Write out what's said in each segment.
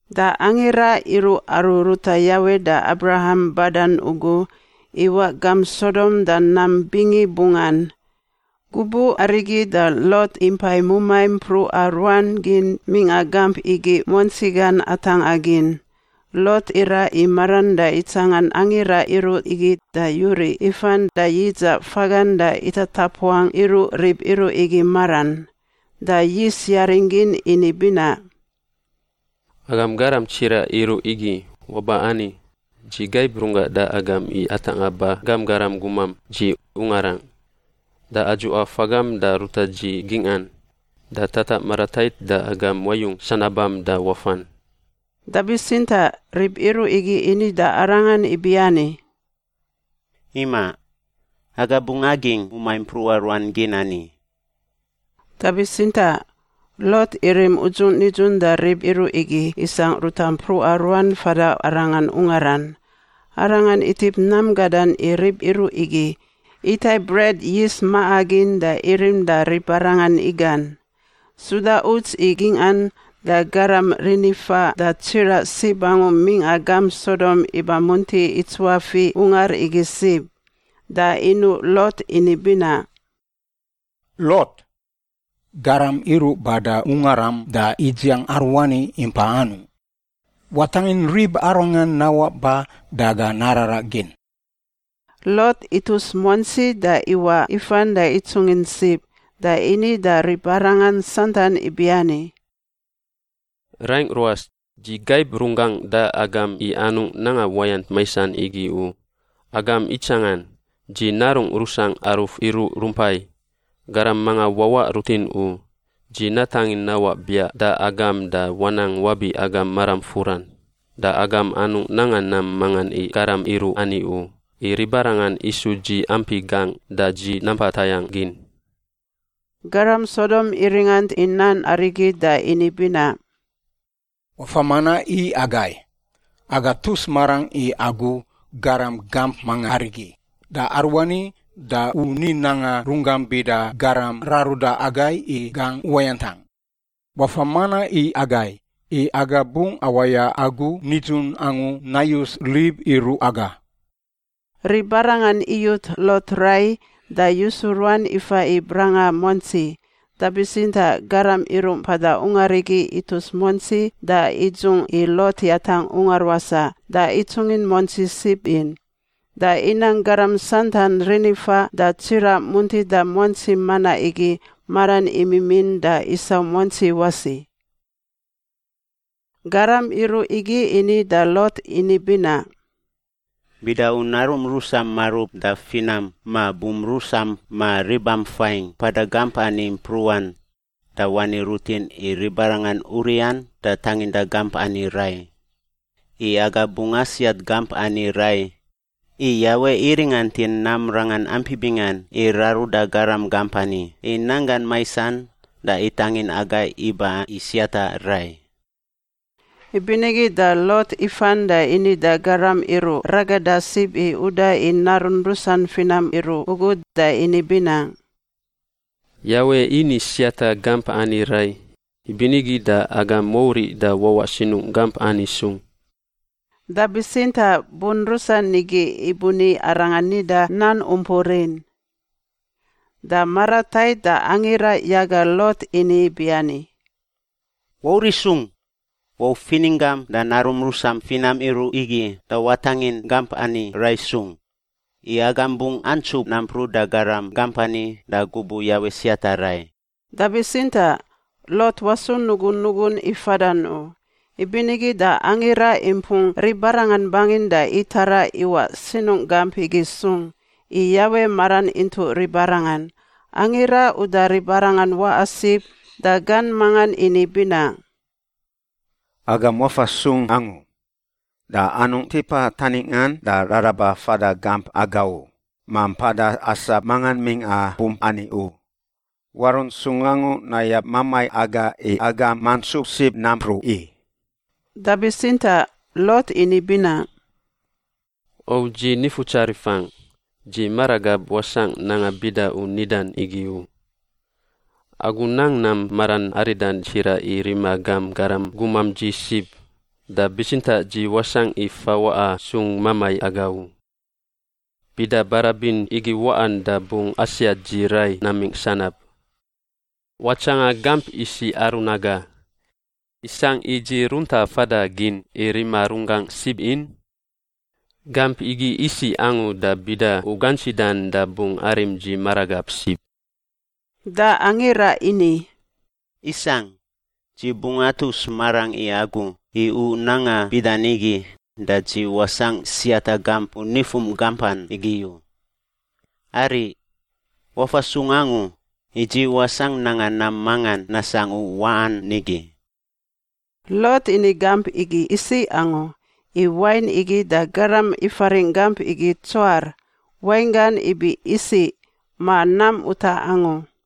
Da angira iruꞌ aru ruta Yawe da Abraham badan ugu iwaꞌ gamp Sodom da nam bingibungan. Gubuꞌ arigi da Lot impai mumai mpruꞌa ruan gin mingꞌa gamp igi muantsi gan atangꞌa gin. Lot iraꞌ i maran da itsangan angira iruꞌ igi da yuriꞌ ifan da yidzaꞌ fagan da itatapuangꞌ iruꞌ rib iruꞌ igi maran, da yis yaring gin ini binaꞌ, “Agam garam tsiraꞌ iruꞌ igi, waba ani, dzi gaib runggangꞌ da agam i atangꞌa ba gam garam gumam dzi ungarangꞌ. Da adzuꞌa fagam da ruta dzi gingꞌan, da tataꞌ maratait da agam wayung sanabam da wafan.” Da bitsintaꞌ rib iruꞌ igi ini da arangan ibiani, “Imaꞌ. Aga bungꞌ agingꞌ mumai mpruꞌa ruan gin ani.” Da bitsintaꞌ Lot irim udzung nidzun da rib iruꞌ igi isangꞌ ruta mpruꞌa ruan fada arangan ungaran. Arangan itip nam gadan i rib iruꞌ igi, itai bret yis maꞌa gin da irim da ribarangan igan. Suda uts i gingꞌan da garam rinifaꞌ da tsiraꞌ sib angu mingꞌa gamp Sodom iba munti itsuafiꞌ ungar igi sib. Da inuꞌ Lot ini binaꞌ, “Lot! Garam iruꞌ bada ungaram da idziang aruani impai anungꞌ? Watangin ribarangan nawaꞌ ba da aga nararaꞌ gin.” Lot itus muantsi da iwaꞌ ifan da itsungin sib da ini da ribarangan santan ibiani, “Raingꞌ ruas, dzi gaib runggangꞌ da agam i anungꞌ nanga uwayant maisan igi u. Agam itsangan. Dzi narungꞌ rusangꞌ aruf iruꞌ rumpai. Garam mangan wawaꞌ rutin u. Dzi natangin nawaꞌ biaꞌ da agam da wanang wabi agam maram furan. Da agam anungꞌ nanga nam mangan i garam iruꞌ ani u, i ribarangan isu dzi ampi gangꞌ da dzi nampa tayangꞌ gin.” Garam Sodom iringant i nan arigi da ini binaꞌ, “Wafa manaꞌ i agai! Aga tus marangꞌ i agu garam gamp manga arigi da aruani da u ni nanga runggam bida garam raruda agai i gangꞌ uwayantangꞌ. Wafa manaꞌ i agai! I aga bungꞌ awaya agu nidzun angu nayus rib iruꞌ aga.” Ribarangan iyut Lot rai da yusu ruan ifa i branga muantsi. Da bitsintaꞌ garam iruꞌ mpada ungar igi itus muantsi da idzungꞌ i Lot yatangꞌ ungar wasaꞌ da itsungin muantsi sib in. Da inang garam santan rinifaꞌ da tsiraꞌ muntida muantsi manaꞌ igi maran imimin da isau muantsi wasi. Garam iruꞌ igi ini da Lot ini binaꞌ, “Bida u narum rusam marub da finam ma bum rusam ma ribam fain mpada gamp ani mpruꞌan, da wani rutin i ribarangan uriꞌan da tanginda gamp ani rai, i aga bungꞌ asiat gamp ani rai, i Yawe iringantin nam rangan ampi bingan i raruda garam gamp ani i nanggan maisan da itangin agai iba i siata rai.” Ibinigi da Lot ifan da ini da garam iruꞌ ragada sib i uda i narun rusan finam iruꞌ ugu da ini binaꞌ, “Yawe ini siata gamp ani rai, ibinigi da agam wauriꞌ da wawaꞌ sinungꞌ gamp ani sung.” Da bitsintaꞌ bun rusan igi ibuni arangan nida nan umpur in. Da maratait da angira yaga Lot ini ibiani, “Wauriꞌ sung! Wau fininggam da narum rusam finam iruꞌ igi da watangin gamp ani rai sung, i agam bungꞌ antsup nampruꞌ da garam gamp ani da gubuꞌ Yawe siata rai.” Da bitsintaꞌ Lot wasu nugunugun i fadan u, ibinigi da angira impung ribarangan bangin da itaraꞌ iwaꞌ sinungꞌ gamp igi sung, i Yawe maran intuꞌ ribarangan. Angira uda ribarangan waꞌa sib da gan mangan ini binaꞌ, “Agam wafa sung angu! Da anungꞌ tipa taningꞌan da raraba fada gamp aga u, ma mpada asap mangan mingꞌa bump ani u. Warunt sung angu nayab mamai aga i agam mantsup sib nampruꞌ i.” Da bitsintaꞌ Lot ini binaꞌ, “O dzi nifutsarifangꞌ. Dzi maragab wasangꞌ nanga bida u nidan igi u! Agu nang nam maran aridan tsiraꞌ i rima gam garam gumam dzi sib, da bitsintaꞌ dzi wasangꞌ i fawaꞌa sung mamai aga u. Bida barabin igi waꞌan da bungꞌ asiat dzi rai namingꞌ sanab. Watsanga gamp isiꞌ aru naga. Isangꞌ i dzi runta fada gin i rima runggangꞌ sib in? Gamp igi isiꞌ angu da bida u gantsidan da bungꞌ arim dzi maragab sib.” Da angira ini, “Isangꞌ, dzi bungꞌ atus marangꞌ i agu i u nanga bida nigi da dzi wasangꞌ siata gamp u nifum gampan igi u. Ariꞌ! Wafa sung angu, i dzi wasangꞌ nanga nam mangan nasangꞌ u waꞌan nigi.” (Lot ini gamp igi isiꞌ angu, i wain igi da garam ifaringꞌ gamp igi Tsoar, wainggan ibi isiꞌ ma nam utaꞌ angu.)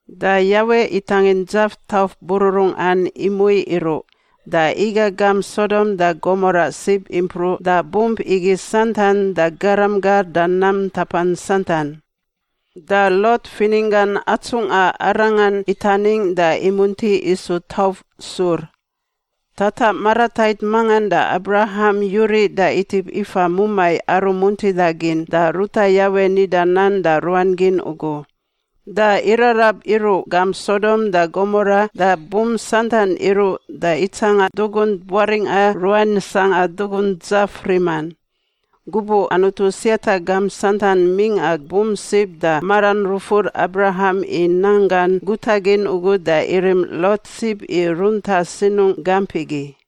Da Yawe itangin dzaf tauf bururungꞌan imui iruꞌ da iga gamp Sodom da Gomora sib impruꞌ da bump igi santan da garam gar da nam ntapan santan. Da Lot fininggan atsungꞌa arangan itaningꞌ da imunti isu tauf sur. Tataꞌ maratait mangan da Abraham yuriꞌ da itip ifa mumai aru muntidagin da ruta Yawe nida nan da ruan gin ugu. Da irarab iruꞌ gamp Sodom da Gomora da bump santan iruꞌ da itsanga dugunt buaringꞌa ruan sangꞌa dugunt dzaf riman. Gubuꞌ Anutu siata gamp santan mingꞌa bump sib da maran rufur Abraham i nan gan gutagin ugu da irim Lot sib i runta sinungꞌ gamp igi.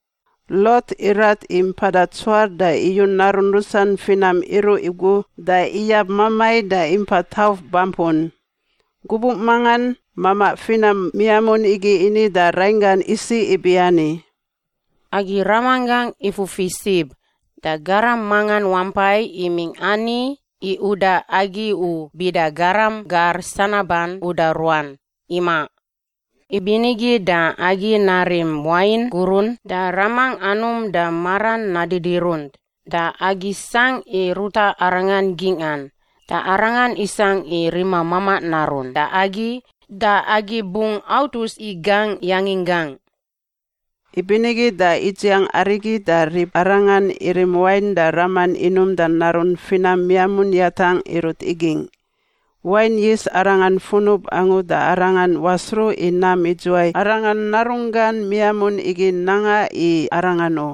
Lot irat i mpada Tsoar da iyu narun rusan finam iruꞌ ugu da iyab mamai da impa tauf bampun. Gubuꞌ mangan mamaꞌ finam miamun igi ini da rainggan isiꞌ ibiani, “Agi ramanggangꞌ ifufi sib, da garam mangan wampai imingꞌ ani i uda agi u, bida garam gar sanaban uda ruan, imaꞌ. Ibinigi da agi narim wain gurun da ramangꞌ anum da maran nadidirunt da agi sangꞌ i ruta arangan gingꞌan da arangan isangꞌ i rima mamaꞌ narun da agi da agi bungꞌ autus i gangꞌ yanginggangꞌ.” Ibinigi da idziang arigi da ribarangan irim wain da raman inum da narun finam miamun yatangꞌ irut igingꞌ. Wain yis arangan funub angu da arangan wasruꞌ i nam idzuwai arangan narunggan miamun igi nanga i arangan u.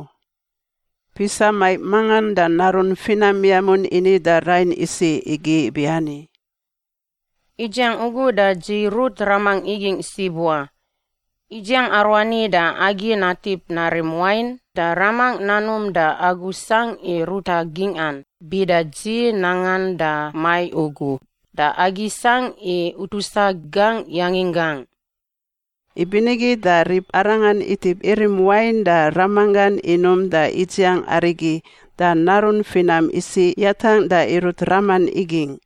Pisa maiꞌ mangan da narun finam miamun ini da rain isiꞌ igi ibiani, “Idziang ugu da dzi rut ramangꞌ igingꞌ sib wa. Idziang aruani da agi natip narim wain da ramangꞌ nanum da agu sangꞌ i ruta gingꞌan bida dzi nangan da maiꞌ ugu, da agi sangꞌ i utusa gangꞌ yanginggangꞌ.” Ibinigi da ribarangan itip irim wain da ramanggan inum da idziang arigi da narun finam isiꞌ yatangꞌ da irut raman igingꞌ.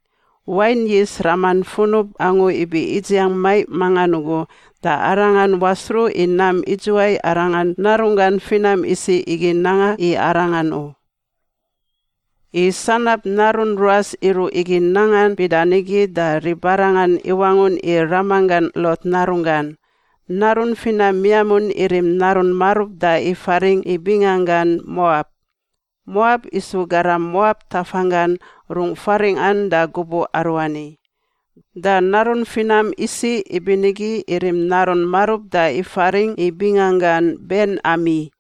Wain yis raman funub angu ibi idziang maiꞌ mangan ugu da arangan wasruꞌ i nam idzuwai arangan narunggan finam isiꞌ igi nanga i arangan u. I sanab narun ruas iruꞌ igi nangan bida nigi, da ribarangan iwangun i ramanggan Lot narunggan. Narun finam miamun irim narun marub da ifaringꞌ i binganggan Moab. Moab isu garam Moab tafanggan rung faringꞌan da gubuꞌ aruani. Da narun finam isiꞌ ibinigi irim narun marub da ifaringꞌ i binganggan Ben-Ami.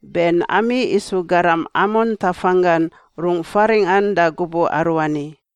Ben-Ami isu garam Amon tafanggan rungꞌ faringꞌan da gubuꞌ aruani.